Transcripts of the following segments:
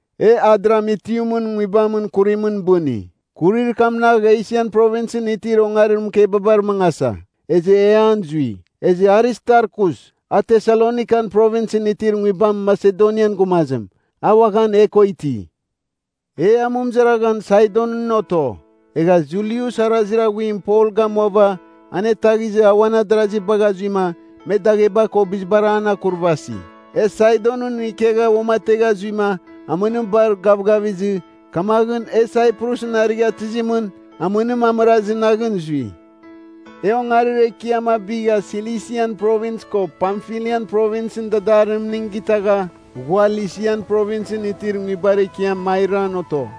E Adramitiumɨn nguibamɨn kurimɨn bɨni. Kurir kamnagh Esian Provinsɨn itir ongarir mɨkebabar mangasa, ezɨ e an zui. Ezɨ Aristarkus, a Tesalonikan Provinsɨn itir nguibam Masedonian gumazim, a uaghan e ko iti. E amɨmɨzaraghan Saidonɨn oto. Egha Julius arazir aghuim Pol gamuava anetaghizɨ a uan adarazi bagha zuima me dagheba ko bizibar an akurvasi. E Saidonɨn ikegha uamategha zuima amɨnim bar gavgavizɨ, kamaghɨn e Saiprusɨn arighatɨzimɨn amɨnim amɨrazir naghɨn zui. E ongarir ekiam a bigha Silisian Provins ko Pamfilian Provinsɨn dadarimning gitagha ghua Lisian Provinsɨn itir nguibar ekiam Mairan oto.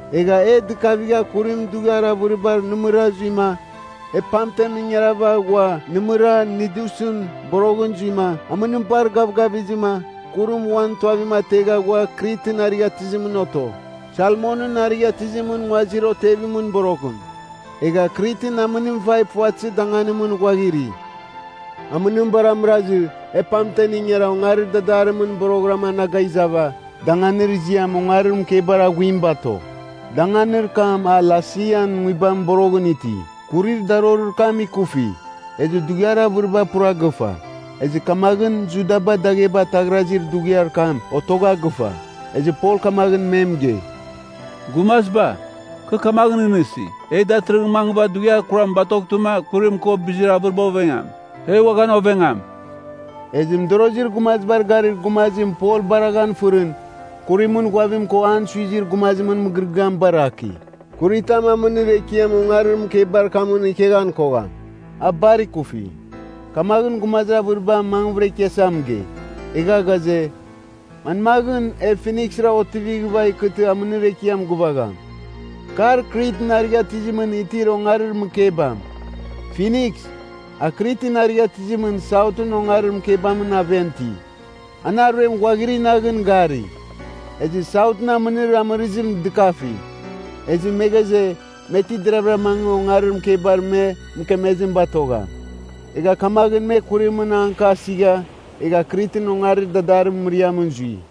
Egha e dɨkavigha kurim dughiar avɨribar nɨmɨra zuima e pamten ingarava ghua nɨmɨra Nidusɨn boroghɨn zuima, amɨnim bar gavgavizɨma kurim uan tuavim ategha ghua Kritɨn arighatɨzimɨn oto, Salmonɨn arighatɨzimɨn nguazir otevimɨn boroghɨn. Egha Kritɨn amɨnim vai puvatɨzir danganimɨn ghuaghiri. Amɨnim bar amɨrazɨ, e pamten ingara ongarir dadarimɨn boroghɨram anaga izava, danganir ziam Ongarir Mɨkebar Aghuim bato. Danganir kam a Lasean nguibamɨn boroghɨn iti. Kurir darorir kam ikufi; ezɨ dughiar avɨriba pura gɨfa. Ezɨ kamaghɨn Judaba dagheba ataghrazir dughiar kam otogha gɨfa. Ezɨ Pol kamaghɨn me mɨgei, “Gumaziba, kɨ kamaghɨn nɨghnɨsi, e datɨrɨghɨra mangɨva dughiar kuram batoghtɨma kurim ko bizir avɨriba ovengam. E uaghan ovengam.” Ezɨ mɨdorozir gumazibar garir gumazim Pol baraghan fɨrɨn, kurimɨn ghuavim ko an suizir gumazimɨn mɨgɨrɨgɨam baraki. Kuritam amɨnir ekiamɨn ongarir mɨkebar kamɨn ikeghan kogham. A bar ikufi. Kamaghɨn gumazir avɨriba mangvɨra ikiasa mɨgei. Egha ghaze, manmaghɨn e Finiksra otivighɨva ikɨtɨ amɨnir ekiam gɨvagham. Kar Kritɨn arighatɨzimɨn itir ongarir mɨkebam. Finiks, a Kritɨn arighatɨzimɨn Sautɨn ongarir mɨkebamɨn aven iti. An aruem ghuaghiri naghɨn gari. Ezɨ Sautɨn amɨnir amɨrɨzim dɨkafi. Ezɨ me ghaze, me ti deravɨra mangɨ ongarir mɨkebar me mɨkemezim batogham. Egha kamaghɨn me kurimɨn anka asigha egha Kritɨn ongarir dadarimɨn mɨriamɨn zui.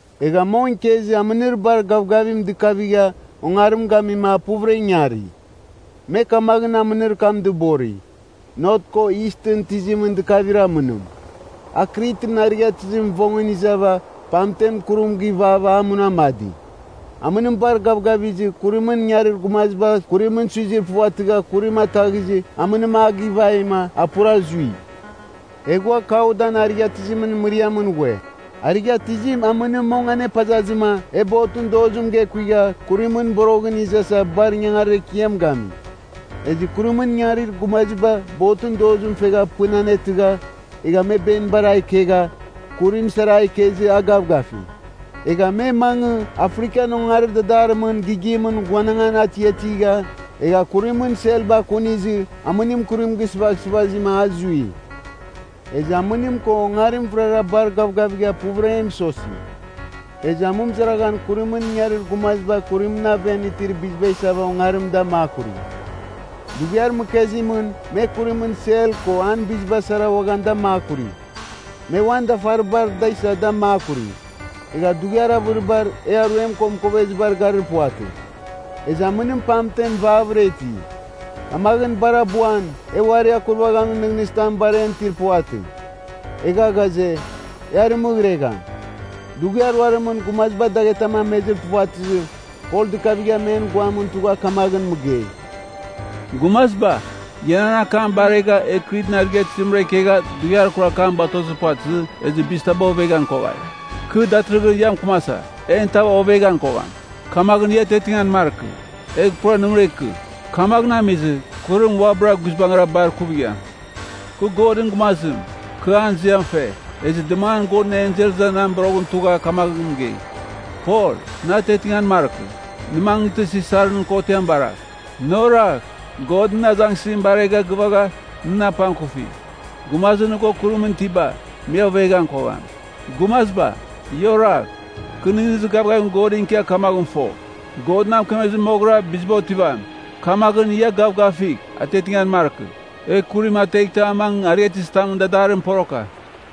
Egha mong ikezɨ amɨnir bar gavgavim dɨkavigha ongarim gamima a puvɨra ingari. Me kamaghɨn amɨnir kam dɨbori, “Not ko Istɨn tizimɨn dɨkavir amɨnim.” A Kritɨn arighatɨzimɨn vongɨn izava pamten kurim givava a munamadi. Amɨnim bar gavgavizɨ kurimɨn ingarir gumaziba kurimɨn suizir puvatɨgha kurim ataghizɨ amɨnim a givaima a pura zui. E ghua Kaudan arighatɨzimɨn mɨriamɨn ghue. Arighatɨzim amɨnim mong anepazazɨma e botɨn dozim gekuigha kurimɨn boroghɨn izasa bar ingangarir ekiam gami. Ezɨ kurimɨn ingarir gumaziba botɨn dozim fegha pɨn anetɨgha, egha me benibar a ikegha, kurim sara a ikezɨ a gavgafi. Egh me mangɨ Afrikan ongarir dadarimɨn gighimɨn ghuanangan atiatigha, egha kurimɨn selba akunizɨ amɨnim kurim gɨsɨvaghsɨvazima a zui. Ezɨ amɨnim ko ongarim vɨrara bar gavgavigha puvɨra e mɨsosi. Ezɨ amɨmɨzaraghan kurimɨn ingarir gumaziba kurimɨn aven itir biziba isava ongarim da makuri. Dughiar mɨkezimɨn me kurimɨn sel ko an biziba sara uaghan da makuri. Me uan dafaribar da isa da makuri. Egha dughiar avɨribar e aruem ko mɨkovezibar garir puvatɨ. Ezɨ amɨnim pamtem vavɨra iti. Kamaghɨn bar abuan e uarir akurvaghamin nɨghnɨzitam bar en itir puvatɨ. Egha ghaze, e arɨmɨghregham. Dughiar ruarimɨn gumaziba daghetam amezir puvatɨzɨ, Pol dɨkavigha men guamɨn tugha kamaghɨn mɨgei, “Gumaziba, ia nan akam baregha, e Kritɨn arighatɨzimra ikegha dughiar kurar kam batozir puvatɨzɨ, ezɨ bizitaba oveghan koghai. Kɨ datɨrɨghɨn ia mɨkɨmasa, en tav oveghan kogham. Kamaghɨn ia atiatingan markɨ, egh pura nɨmɨra ikɨ. Kamaghɨn amizɨ, kurim uabɨra guizbangɨra bar ikuvigham. Kɨ Godɨn gumazim, kɨ an ziam fe. Ezɨ dɨmangan Godɨn ensel iza na boroghɨn tugha kamaghɨn mɨgei, ‘Pol, nɨ atiatingan markɨ. Nɨ mangɨtɨ, Sisar nɨn kotiam baragh. Nɨ oragh, God nɨn azangsɨzim baregha gɨvagha nɨn apangkufi. Gumazir nɨ ko kurimɨn itiba, me oveghan kogham.’ Gumaziba, ia oragh! Kɨ nɨghnɨzir gavgavim Godɨn ikia kamaghɨn fo, God na mɨkemezɨ moghɨra biziba otivam. Kamaghɨn, ia gavgafigh atiatingan markɨ E kurim ateghtɨ a mangɨ arighatɨzitamɨn dadarimɨn poroka.”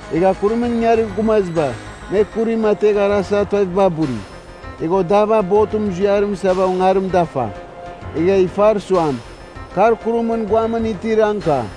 Egha kurimɨn ingarir gumaziba, me kurim ategh arasa tuaviba buri. Egha odava botɨn muziarim isava ongarim dafa. Egh ifar suam, kar kurimɨn guamɨn tir anka.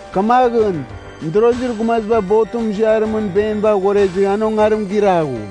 Kamaghɨn mɨdorozir gumaziba botɨn muziarimɨn beniba aghorezɨ an ongarim giraghu.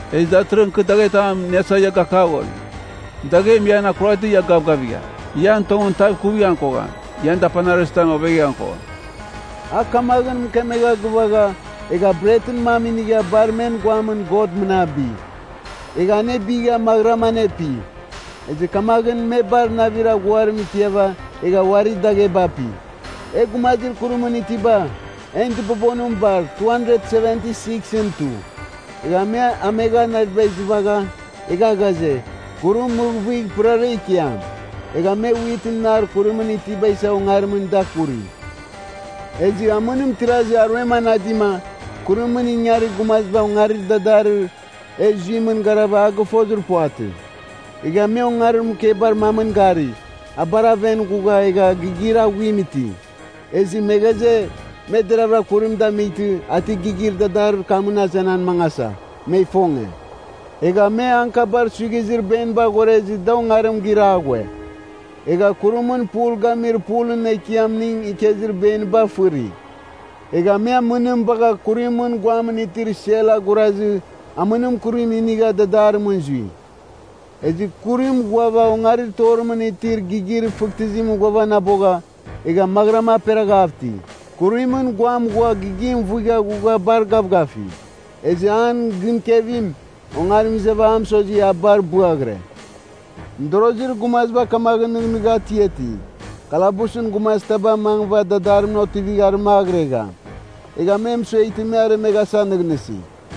Ezɨ datɨrɨghɨn kɨ daghetam iniasa ia gakaghori. Daghem ian akuraghtɨ ia gavgavigham. Ian tongɨn tav ikuvighan kogham. Ian dapanir arɨzitam oveghan kogham.” A kamaghɨn mɨkemegha gɨvagha, egha bretɨn mam inigha bar men guamɨn God mɨnabi. Egha anebigha maghɨram anepi. Ezɨ kamaghɨn me bar navir aghuarim ikiava egha uari dagheba api. E gumazir kurimɨn itiba, en dɨbobonim bar 276ɨn tu. Egha me amegha naviba izɨvagha, egha ghaze, kurim mɨghɨvghigh pɨrara ikiam. Egha me witɨn nar kurimɨn itiba isa ongarimɨn da akuri. Ezɨ amɨnim tirazɨ aruem anadima, kurimɨn ingarir gumaziba ongarir dadarir e zuimɨn garava a gɨfozir puvatɨ. Egha me ongarir mɨkebar mamɨn gari, a bar aven ghugha egha gigir aghuim iti. Ezɨ me ghaze, me deravɨra kurim damightɨ a ti gigir dadarir kamɨn azenan mangasa, me ifonge. Egha me ankabar suighizir beniba aghorezɨ da ongarim giraghue. Egha kurimɨn pul gamir pulɨn ekiamning ikezir beniba fɨri. Egha me amɨnim bagha kurimɨn guamɨn itir sel agurazɨ amɨnim kurim inigha dadarimɨn zui. Ezɨ kurim ghuava ongarir torimɨn itir gigir fɨghtɨzimɨn ghuavanabogha, egha maghɨram aperaghav iti. Kurimɨn guam ghua gigim vuigha ghugha bar gavgafi. Ezɨ an gɨnkevim, ongarim izava a mɨsozi a bar bɨaghɨre. Mɨdorozir gumaziba kamaghɨn nɨghnɨgha atiati, kalabusɨn gumazitaba mangɨva dadarimɨn otivigh arɨmagɨregham. Egha me mɨsueghtɨ me aremeghasa nɨghnɨsi.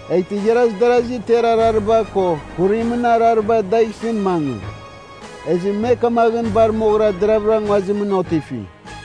Eghtɨ igharazir darazi ter arariba ko kurimɨn arariba dagh isɨn mangɨ. Ezɨ me kamaghɨn bar moghɨra deravɨra nguazimɨn otifi.